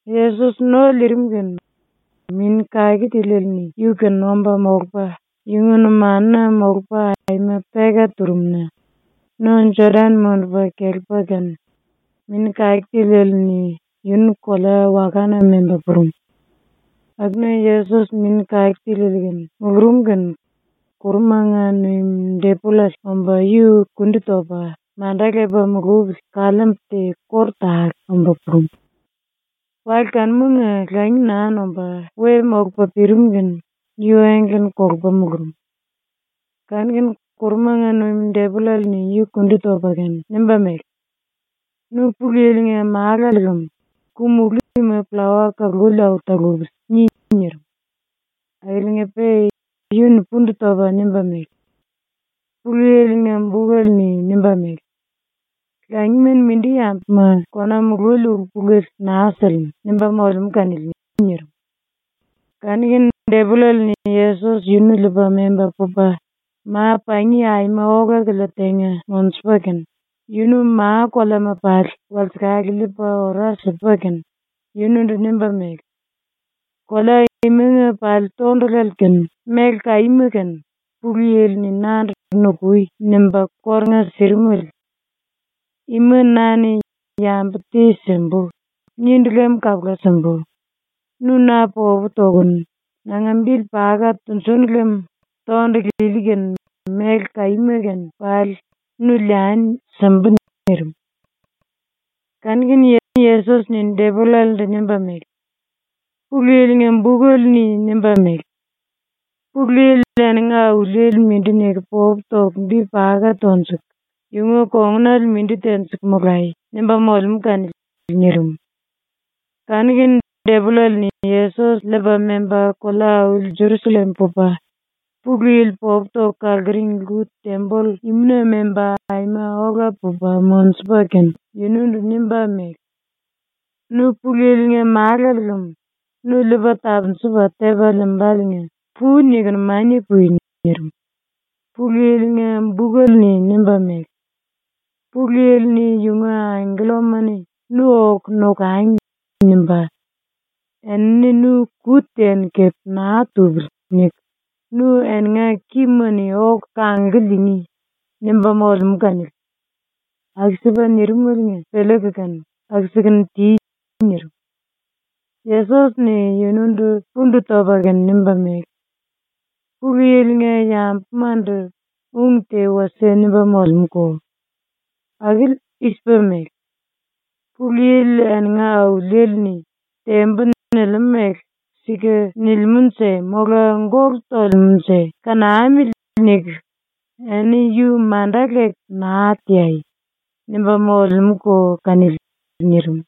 Yesos ⸤no liirim kene⸥ Mini Kake Tiliele-ni yu-kene omba molupa yunga numanuna molupa aima peka turum-na no Jodan mundupa kelepa kene, Mini Kake Tiliele-ni yunu kolea-wakana memba purum. Akuna Yesos ⸤Mini Kake Tiliele kene mulurum kene⸥ ⸤kurumanga nuim⸥ depollale omba yu kondi topa manda lepa mulupili kaliimbu te kóru tale omba purum. Wale kanumanga langi naa nomba we molupa pirim kene yu engle-ni kolupa mulurum. Kanu-kene ⸤kurumanga nuim⸥ depollale-ni yu ⸤kundi topa kene⸥ nimba mele: “Nu Pulu Yili-nga Málale lem ku-mulú ima ‘Pllawa kaluli au talupili.’ ni.” nirim. Akiliinga-pe yu-ni pundu topa nimba mele: “Pulu Yili-nga bukele-ni nimba mele: “Langima-ni mindi yambuma kona mululi ulu-pulele naa silimú.” nimba molemú kanili.” nirim. Kanu-kene depollale-ni Yesos yunu liipa memba pupa ⸤ma-pangi⸥ aima ola-kilia tenga monjupa kene, yunu ma-koleama pali walsekale liipa ora sipa kene, yunundu nimba mele: “Kolea imanga pali tondulale kene méle kaíma kene Pulu Yili-ni nandu “Nukui.” nimba kórunga sirimele. Ima na-ni ‘Yambu te simbu.’ nindu lem kapula simbu. Nu na popu tokunu nanga bili paka tunjúnu lem tondulu ili kene méle kaíma kene pali nu liani simbu.” nirim. Kanu-kene Yesos-ni depollalendu nimba mele: “Pulu Yili-nga bukele-ni nimba mele: “Pulu Yili eninga Auliele mindi niku popu toku bi paka tonjuku, yunga kongunale mindi tenjiku molai.” nimba molemú kanili.” nirim. Kanu-kene depollale-ni Yesos liipa memba kolea-auli Jerusallem pupa, ⸤Pulu Yili popu toku kaluring⸥ lku-temboll imuna memba, aima ola pupa monjupa kene, yundu nimba mele: “Nu Pulu Yili-nga Málale lem nu liipa tapunjupa tepa liimbáliinga pu-nikunu mania pui.” ⸤nirim.⸥ “Pulu Yili-nga bukele-ni nimba mele: ‘Pulu Yili-ni yunga angkellama-ni ‘Nu oku nokangi.’ nimbá. Enini nu ‘Ku te-ni kepe naa tupili.’ niku nu eninga kima-ni oku kanglku liingí.’ nimba molemú kanili. Aku-sipa nirimaliinga piliiku kene aku-sikunu ti.” nirim. Yesos-ni yundu pundu topa kene nimba mele: “Pulu Yili-nga yambumandu ung te wasie nimba molemúko. Akili i-sipa mele: ‘Pulu Yili eninga Auliele-ni “Tembu.” nilimú mele ‘Sika nilimúnje mola gólu tolemúnje kanamili.’ niku eni yu manda leku naa teai.’ nimba molemúko kanili.” nirim.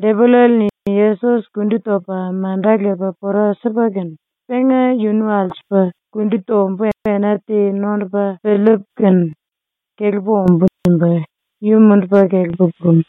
Depollale-ni Yesos kundi topa manda lepa pora sipa kene, ‘Penga yunu alsupu kundi tombu ena te nondupa piliipu kene kelepu ombú.’ nimba yu mundupa kelepa purum.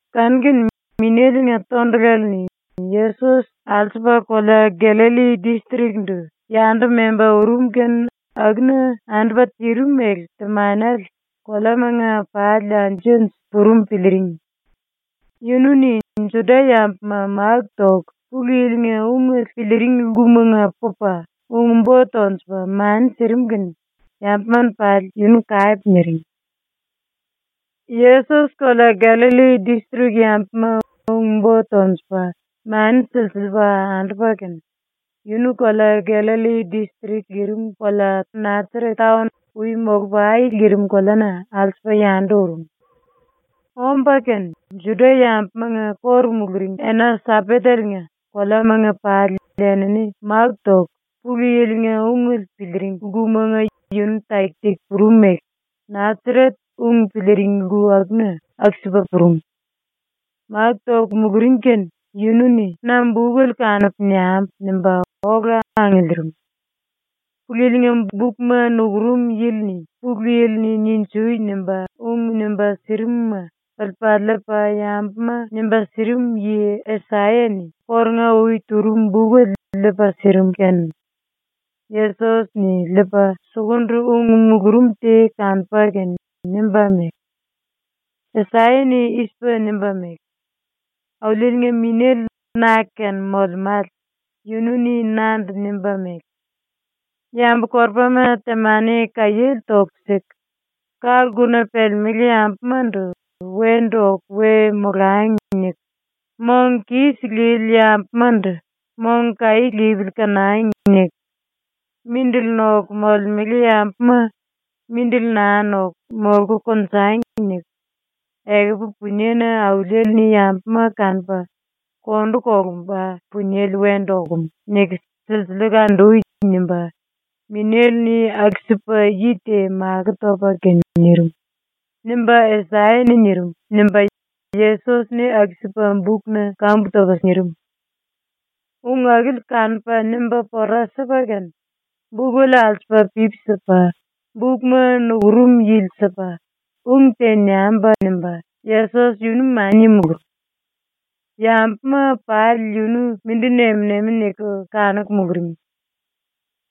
Kanu-kene Minéle-nga tondulale-ni Yesos alsupa kolea Gallalli distrik-ndu yandu memba urum kene akuna andupa tirim mele temanele koleamanga pali anju-anju purum piliiring. Yunu-ni Juda-yambuma máku toku Pulu Yili-nga ungele piliiring lkumanga pupa ung-bo tonjupa mani sirim kene yambuma-ni pali yunu kape niring. Yesos ⸤kolea Gallalli distrik yambuma ung-bo tonjupa mani silsiliipa andupa kene, yunu kolea Gallalli distrik lirim⸥ kolea Nasaret taon ui molupa ai lirim koleana alsupa yandu urum. Omba kene ⸤Juda-yambumanga kóru muluring⸥ ena-Sambateliinga koleamanga pali enini máku toku Pulu Yili-nga ungele piliiring lkumanga yunu taki-taki purum mele Nasaret ung piliiring lku akuna aku-sipa purum. ⸤Máku toku muluring kene⸥ yunu-ni “Na bukele kanupu niambu.” nimba ola angiliirim. ⸤Pulu Yili-nga bukma nukurum yili-ni⸥ Pulu Yili-ni “Ninjui!” nimba ung nimba sirimuma piliipa liipa yambuma nimba sirim yi Asaya-ni kórunga-ui turum bukele liipa sirim kene, Yesos-ni liipa sukundu ung mulurum te kanupa kene nimba mele: “⸤Asaya-ni i-sipa nimba mele:⸥ “Auliele-nga Minéle na-kene molemále yunu-ni nandu nimba mele: “Yambu-korupama temani kaiéle toku siku, ka-lkuna pelemelé yambumandu ‘Wendu oku we molangi.’ niku, mong kis lili yambumandu ‘Mong kaí lipili kanangi.’ niku, mindili noku molemele yambuma ‘Mindili naa noku, molku konjangi.’ niku, ‘Ekupu puniena Auliele-ni yambuma kanupa kondu kolumba puniele wendu okum.’ niku silsiliiku andui.” nimba Minéle-ni aku-sipa yi te makó topa kene nirim.” nimba Asaya-ni nirim.” nimba Yesos-ni aku-sipa bukna kambu topa nirim. Ung akili kanupa nimba pora sipa kene bukele alsupa pipi sipa bukma nukurum yili sipa, ⸤“Ung te niambu.” nimba⸥ Yesos yunu mania mulurum. Yambuma pali yunu mindi nem-nemi niku kanuku muluring.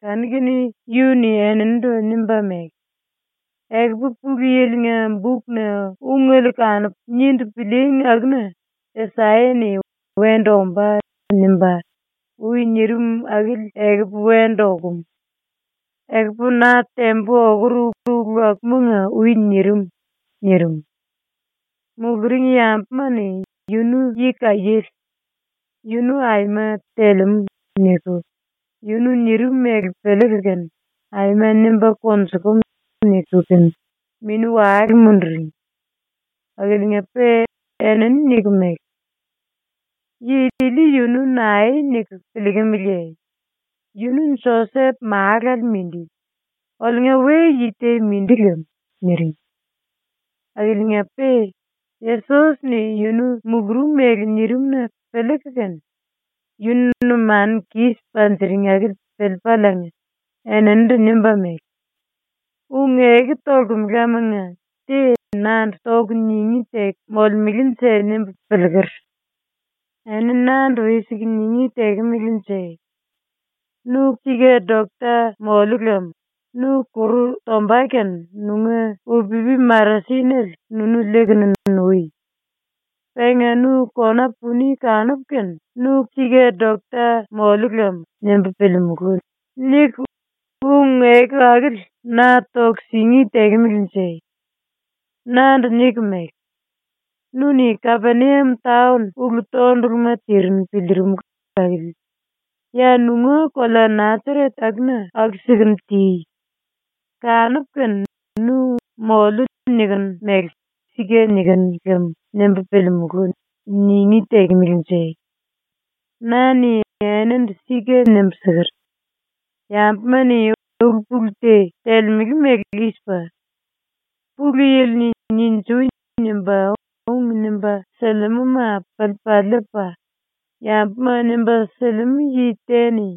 Kanu-kene yunu-ni eninindu nimba mele: “Ekupu Pulu Yili-nga bukna ungele kanupu nindu pilííngi akuna Asaya-ni “Wendu ombá.” nimba, ui nirim akili ekupu wendu okum. ⸤Ekupu na tembu okur ulu akumanga ui nirim.⸥” nirim. Muluring yambuma-ni “Yunu yi kaiéle. Yunu aima telemú.” niku yunu nirim mele piliiku kene “Aima nimba konjukumu.” niku kene mini-wale munduring. ⸤Akiliinga-pe⸥ enini niku mele: “Yi ili ⸤yunu nae niku piliikimiliye?⸥ Yunu Josep málale mindi, ⸤oliunga we-yi te mindi lem⸥.’ niring. ⸤Akiliinga-pe⸥ Yesos-ni ⸤yunu mulurum mele nirim-na piliiku kene yunu numanu kis panjiring akili piliipaliinga⸥ eninindu nimba mele: “Ung-eku tolemelemanga te nandu toku ningí teku molemelenje nimbu piliiker. Eni nandu i-siku ningí tekemelenje: “Nu sika dokta mollu lem nu kuru tomba kene nunga upipi-marasinele nunu liikunu nui. Penga nu kona puni ⸤kanupu kene ‘Nu sika dokta mollu lem.’ nimbu piliimulú.” niku ung-eku akili na toku singí tekemelenje?⸥ Nandu niku mele: “Nu-ni Kapeniam taon ulu-tonduluma tirinu piliirimulu akili ya nunga kolea ⸤Nasaret⸥ akuna aku-sikunu ti. ⸤Kanupu kene nu “moliu.” nikinu mele ‘Sika nikinu lem.’ nimbu piliimulú.⸥” ningí tekemelenje? “Na-ni enindu sika nimbu siker: “Yambuma-ni ulu-pulu te telemele mele i-sipa: Pulu Yili-ni “Ninjui!” nimba ung nimba silimúma piliipa liipa yambuma nimba silimú yi te-ni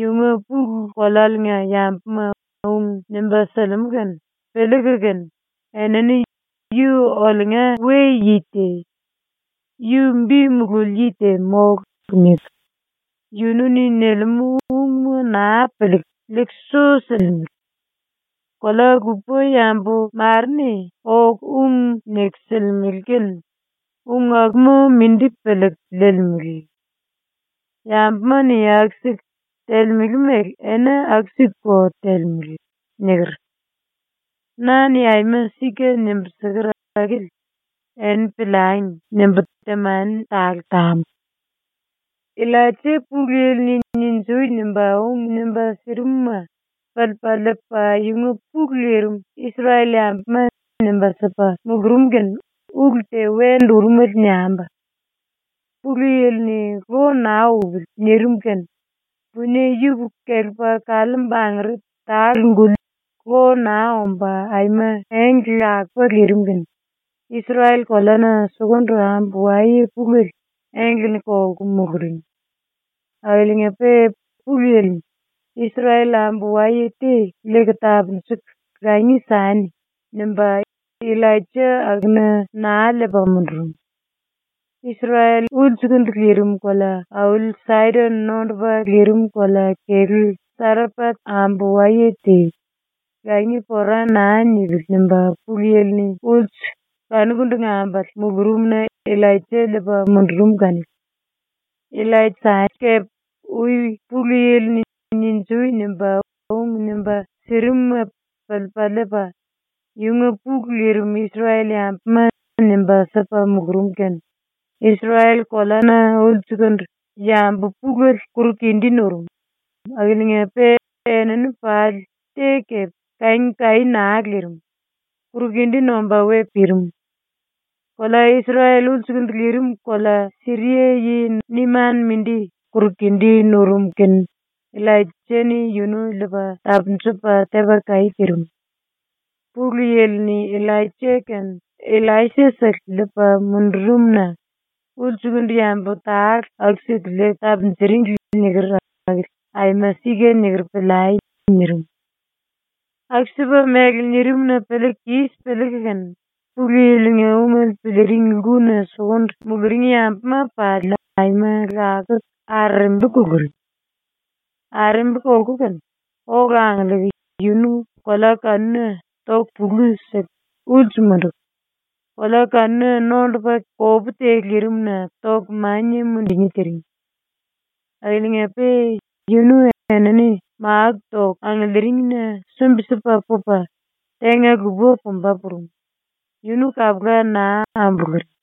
yunga pulu kolealiinga yambuma ung nimba silimú kene piliiku kene enini ‘Yu oliunga we-yi te. Yu bi mululi yi te mólu.’ niku yu-ni nilimú ungma naa piliiku liiku su silimele. ⸤Kolea-lupa yambu mare-ni oku ung niku silimele kene ung akuma mindi piliiku liilimele. Yambuma-ni aku-siku telemele mele eni aku-sikuko telemele.⸥” niker. ‘Na-ni aima sika nimbu siker akili eni piliangi.’ nimbu ⸤temani tale tambu.⸥ “Illaija Pulu Yili-ni “Ninjui!” nimba ung nimba sirimuma piliipa liipa ⸤yunga pulu lirim⸥ Isrel-yambuma nimba sipa mulurum kene ulu te wendu urumele niambu. Pulu Yili-ni “Lo naa upili.” nirim kene punie yupuku kelepa kaliimbu angere tale-guli lo naa omba aima engle lakupa lirim kene Isrel koleana sukundu ambu-waye pulele ⸤engle-ni kolku⸥ muluring. Akiliinga-pe Pulu Yili-ni “Isrel ambu-waye te liiku tapunjuku langi sani.” nimba Illaija akuna naa liipa mundurum. ⸤Isrel ulsukundu lirim⸥ kolea-auli Saidon nondupa lirim kolea-kelú Sarepat ambu-waye te ⸤‘Langi pora naa nipili.’ nimba Pulu Yili-ni ulsu kanukundu ambale⸥ mulurumna Illaija liipa mundurum kanili. “Illaisa kepe ui Pulu Yili-ni “Ninjui!” nimba ung nimba sirimuma piliipa liipa ⸤yunga pulu lirim Isrel-yambuma⸥ nimba sipa mulurum kene Isrel koleana sukundu yambu pulele kuru-kindí nurum, akiliinga-pe enini pali te kepe kangi kaí naa lirim, kuru-kindí nomba we pirim. ⸤Kolea Isrel ulsukundu lirim⸥ kolea Siria yi Neman mindi kuru-kindí nurum kene Illaisa-ni yunu ⸤liipa tapunjupa⸥ tepa kaí tirim. ⸤Pulu Yili-ni Illaija kene Illaisa-sele liipa mundurum-na ulsukundu yambu tale aku-siku liiku tapunjuringli niker akili aima sika niker piliai.⸥” nirim. Aku-sipa mele nirim-na piliiku kis piliiku kene Pulu Yili-nga ungele piliiring lkuna sukundu muluring yambuma pali aima lakuku arerembi kuluring. Arerembi kolku kene ola angiliiku yunu kolea kanuna toku pulu siku ulsu munduku, kolea kanuna nondupa kopú te lirimna toku mania mundungí tiring. Akiliinga-pe yunu enini máku toku angiliiringina sumbi-sipa pupa tenga-lupa pumba purum, yunu kapula naa ambuluring.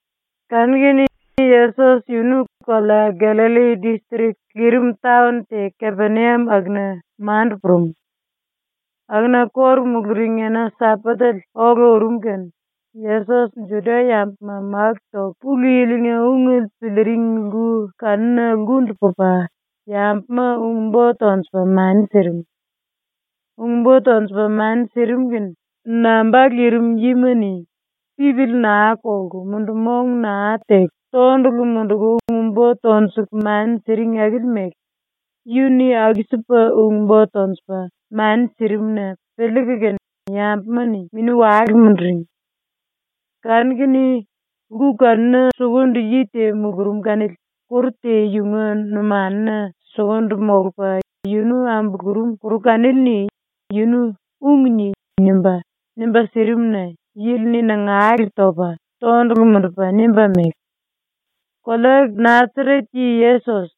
Kanu-kene Yesos yunu kolea Gallalli distrik lirim taon te Kapeniam akuna mandu purum. Akuna ⸤kóru muluring⸥ ena-Sambatele ola urum kene Yesos ⸤Juda-yambuma máku toku Pulu Yili-nga ungele piliiring lku kanuna lkundu pupa⸥ yambuma ung-bo tonjupa mani sirim. Ung-bo tonjupa mani sirim kene namba lirim yima-ni pipili naa kolku mundu-mong naa teku tondulu munduku ung-bo tonjuku mani siring akili mele yunu-ni aku-sipa ung-bo tonjupa mani sirim-na piliiku kene yambuma-ni mini-wale munduring. Kanu-kene lku kanuna sukundu yi te mulurum kanili kuru te yunga numanuna sukundu molupa yunu ambulurum ⸤kuru kanili-ni yunu “Ung ni.” nimba, nimba sirim-na⸥ yili-ni nangale topa tondulu mundupa nimba mele: “Kolea Nasaret yi Yesos,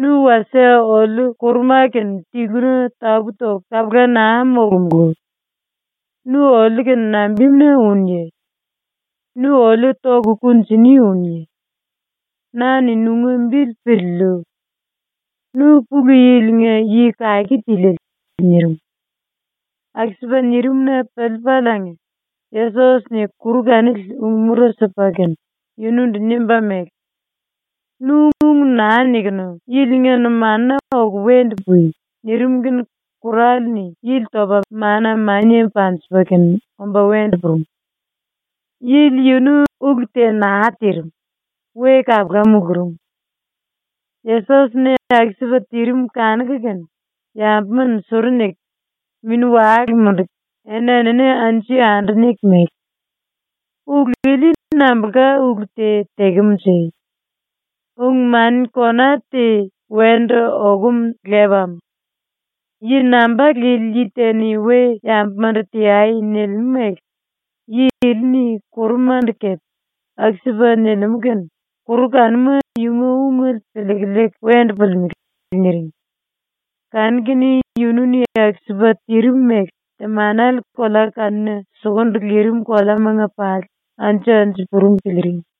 nu wasie oliu ⸤kuruma⸥ kene tiluna tapú topu kapula naa molomulú. Nu oliu-kene nambimuna únuye? Nu oliu toku kunjini únuye? Na-ni nunga bili piliiliu. Nu Pulu Yili-nga Yi Kake Tiliele.” nirim. ⸤Aku-sipa nirim-na piliipaliinga⸥ Yesos-ni kuru kanili ung-mura sipa kene yunundu nimba mele: “Nu ung naa nikunu yilinga numanuna oku wendu pui!” nirim kene kurale-ni yili topa mana mania panjipa kene omba wendu purum. Yili yunu ulu te naa tirim, we kapula mulurum. ⸤Yesos-ni aku-sipa tirim kanuku kene⸥ yambuma suru niku, mini-wale munduku, eni-enini anju-yandu niku mele: “Ulu ili nambulka ulu te tekemunje? Ung-mani kona te wendu okum lepam. Yi namba lili te-ni we-yambumandu “Teai.” nilimú mele yi ili-ni kurumandu kepe aku-sipa nilimú kene kuru kanuma yunga ungele piliiku liiku wendu pulimelé.” niring. Kanu-kene yunu-ni aku-sipa tirim mele temanele kolea kanuna sukundu lirim koleamanga pali anju-anju purum piliiring.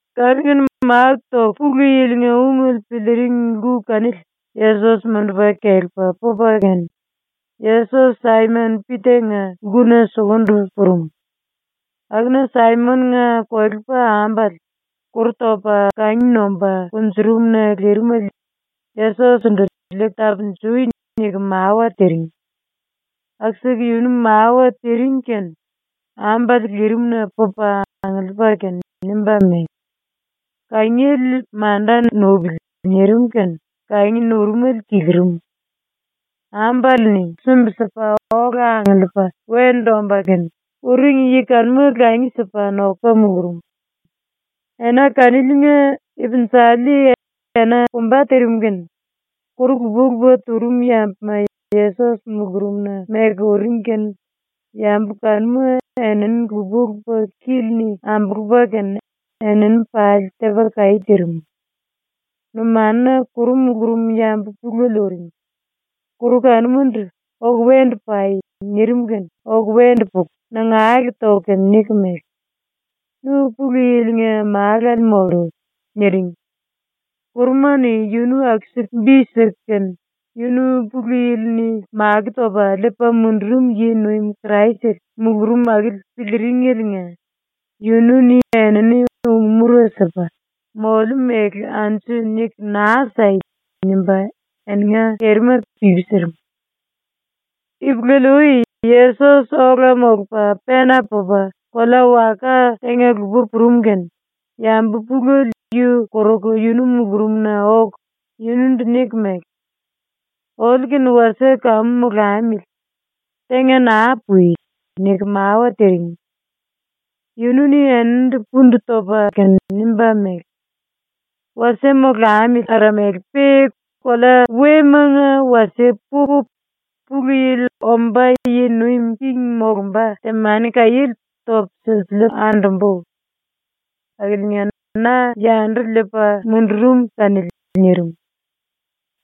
Kanu-kene máku toku Pulu Yili-nga ungele piliiring lku kanili Yesos mundupa kelepa pupa kene, Yesos Saimon-⸤Pita⸥-nga lkuna sukundu purum. Akuna Saimon-nga kolepa-ambale kuru topa kangi nomba kunjurum-na lirimele Yesos-ndu “Liiku tapunjui.” niku mawa tiring. Aku-siku yunu mawa tiring kene ambale lirimna pupa angiliipa kene nimba mele: “Kangiele manda nupili.” nirim kene kangi nurumele kilirim. Ambale-ni sumbi-sipa ola angiliipa wendu omba kene, uring yi kanuma langi sipa nokupa mulurum. Ena kaniliinga ipinjali, ena pumba tirim kene, kuru lupa-lupa turum yambuma Yesos mulurumna meku uring kene yambu kanuma enini lupa-lupa kíli-ni ambulupa kene enini pali tepa kaí tirim. ⸤Numanuna kuru mulurum⸥ yambu pulele ⸤uring.⸥ Kuru kanuma⸤ndu “Oku wendu pai.” nirim kene⸥ oku wendu puku nangale toku kene niku mele: “Nu Pulu Yili-nga Málale mollu.” niring. Kuruma-ni yunu aku-siku bi siku kene yunu ⸤Pulu Yili-ni makó topa liipa mundurum yi-nuim⸥ Kraisele mulurum akili piliiringeliinga yunu-ni enini ung-mura sipa “Moliu mele anju niku naa sai.” nimba eninga kerima pipi sirim. Ipulele-ui Yesos ola molupa pena pupa kolea-waka tenga-lupa purum kene yambu pulele yu koruku yunu mulurumna oku yunundu niku mele: “Oliu-kene wasie kamu molamili. Tenga naa pui.” niku mawa tiring. Yunu-ni eninindu pundu topa kene nimba mele: “⸤Wasie molamili aramele-pe⸥ kolea wemanga wasie pupu, Pulu Yili omba yi nuim king molumba temani-kaiéle topu silsiliipu andumbú. Akiliinga na yandu liipa mundurum kanili.” nirim.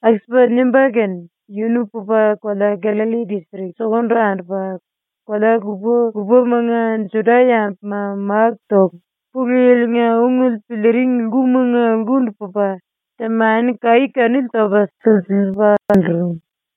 Aku-sipa nimba kene yunu pupa kolea Gallalli ⸤distrik⸥ sukundu andupa, kolea lupa-lupamanga Juda-yambuma máku toku Pulu Yili-nga ungele piliiring lkumanga lkundu pupa temani-kaí kanili topa silsiliipa andurum.